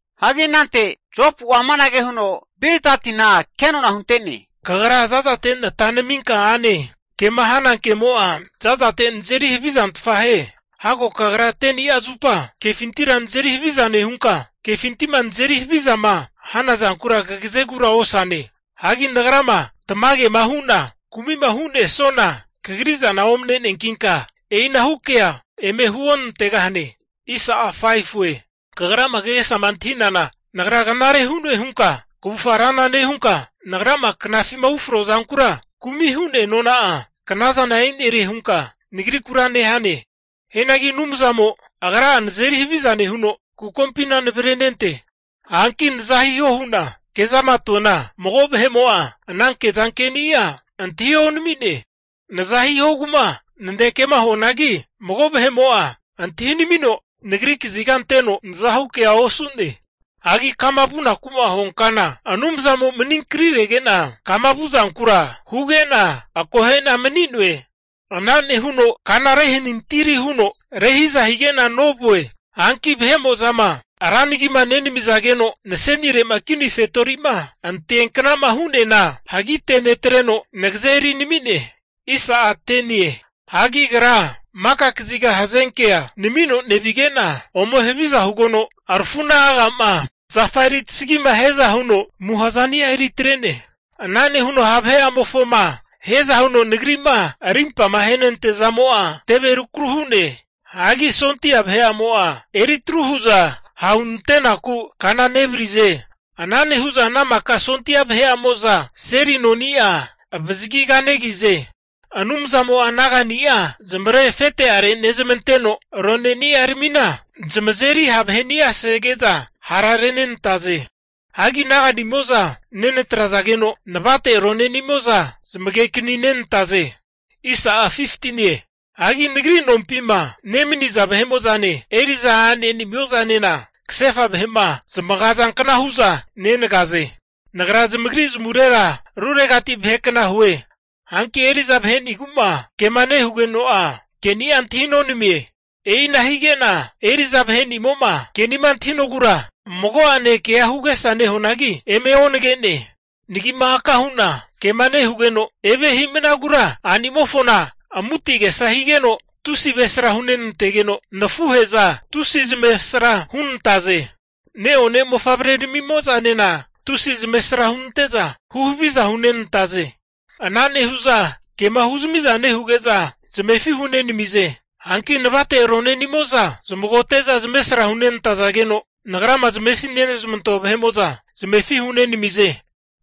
Hagi anante Jopu'a amanage huno Bildatina kenona hunte'ne, Kagra zazate nata naminka ane. Kema hana kemo'a zazate nazeri havizantfa hie. Hago kagra 10ni'a zupa kefintira nazeri haviza nehunka, kefinti'ma nazeri havizama hanazankura kagazegura osane. Hagi nagrama tamagema hu'na kumi'ma hu'nesuana, kagri zana omne'neankinka e'inahu kea eme huonantegahane. Kagrama kagesama antahinana, nagra knare hu'noe hunka kavufga rana nehunka, nagrama knafima ufroa zankura kumi hu'nea nona'a knazana e'nerie hunka nagrikura nehane. Hianagi Anumzamo Agra'a nazeri haviza nehuno, kukompina navrenente. Hanki naza hiho hu'na kezama atuana, mago vahe'mo'a ana kezankeni'a antahi onami'ne. Naza hihogu'ma nanekea huanagi, mago vahe'mo'a antahinamino nagri kaziga anteno nazahu kea osu'ne. Hagi kama vunaku'ma huankana Anumzamo maninkanirege'na kama vu'zankura huge'na, akohe'na mani'noe. Ana nehuno kana rehanintiri huno rehiza hige'na novue. Hanki vahe'mo'zama ra nagima nenamizageno nasenire'ma kini fetori'ma anteanknama hu'neana, hagitenetreno nagaze erinami'ne. Hagi Agra maka kaziga hazenkea namino nevige'na ome haviza hugeno, arafu'na aga'ma zafa eri tasagima hiaza huno amuha zani'a eri atrene. Ana nehuno ha' vahe'amofoma hiaza huno nagri'ma arimpa ahenante'nea zamo'a teve rukru hu'ne. Hagi sondia vahe'amo'za eritru hu'za hahunante'naku kana nevarize. Ana nehu'za ana maka sondia vahe'amo'za seli noni'a avazagi kanegize. Anumzamo'a naga'ni'a zamavare afete'are nezmanteno, roneni'aramina zamazeri ha' vahe'ni'a sege'za hara renenantaze. Hagi naga'nimo'za nenatrazageno, navate aronenimo'za zamage'akaninantaze. Hagi nagri nompima nemaniza vahe'mo'zane, eri'za a'nemo'zanena kasefa vahe'ma zamagazankna hu'za nenagaze. Nagra zamagri zamavurera ruregati vahekna hue. Hanki eri'za vahe'nigu'ma kema nehugeno'a, ke'ni'a antahinonamie. E'ina hige'na eri'za vahe'nimo'ma ke'nima antahinogura mago'ane kea hu agesa nehuanagi, eme onage'ne. Nagi'ma aka hu'na kema nehugeno evia himnagura a'nimofona amuti agesa higeno, tusi avresra hunenantegeno, nafuhe'za tusi zamavesra hunantaze. Ne'one mofavreramimo'zanena tusi zamavaresra hunante'za huhaviza hunenantaze. Ana nehu'za kema huzmi'zama nehuge'za zamefi hunenamize. Hanki navate aronenimo'za zamagote'za zamavesra hunenantazageno, nagrama navesi nezmantoa vahe'mo'za zamefi hunenamize.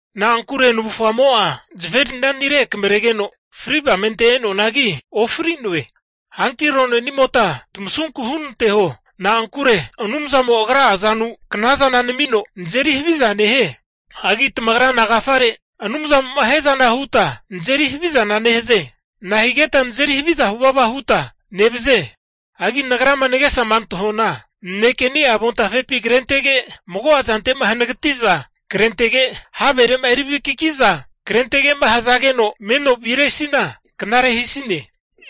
Na'ankure navufgamo'a zaferinanire akamarege'na, fri' avamente e'noanagi ofri'noe. Hanki aronenimota tamasunku hunanteho. Na'ankure Anumzamo'a Agra'a azanu knazana namino, nazeri haviza nehie. Hagi tamagra nagafare Anumzamo'ma hiazana huta, nazeri havizana nehaze? Nahigeta nazeri haviza huvava huta nevaze? Hagi nagrama nagesama antahuana, nanekeni'a avontafepi krentege, mago'a zante'ma hanagati'za krentege, havere'ma eri vakiki'za krentege'ma hazageno meno viresina knare hisine.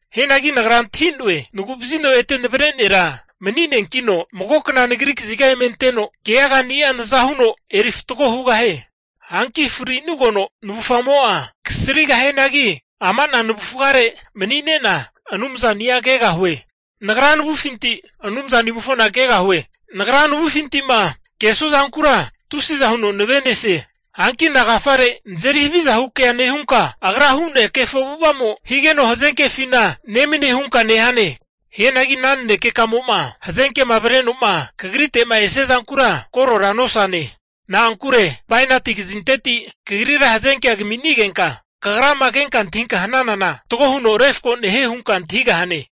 Hianagi nagra antahi'noe, nagu'vazino ete Navre Nera mani'neankino, magokna nagri kaziga eme anteno keagani'a naza huno eri fatgo hugahie. Hanki fri'nugeno navufgamo'a kasrigahianagi, ama ana navufgare mani'ne'na Anumzani'a kegahue. Nagra navufinti Anumzanimofona kegahue. Nagra navufinti'ma kesua zankura tusiza huno nave'nesie. Hanki nagafare nazeri havizahu kea hunka, agra hu'nea kefo avu'ava'mo higeno hazenkefina nemanie hunka nehane. Hianagi ana nanekekamo'ma hazenkema avreno'ma kagrite'ma esia zankura korora nosane. Na'ankure bainati kazinteti kagrira hazenkea kaminigenka kagrama kenka antahinka hanana, fatgo huno refko nehie hunka antahigahane.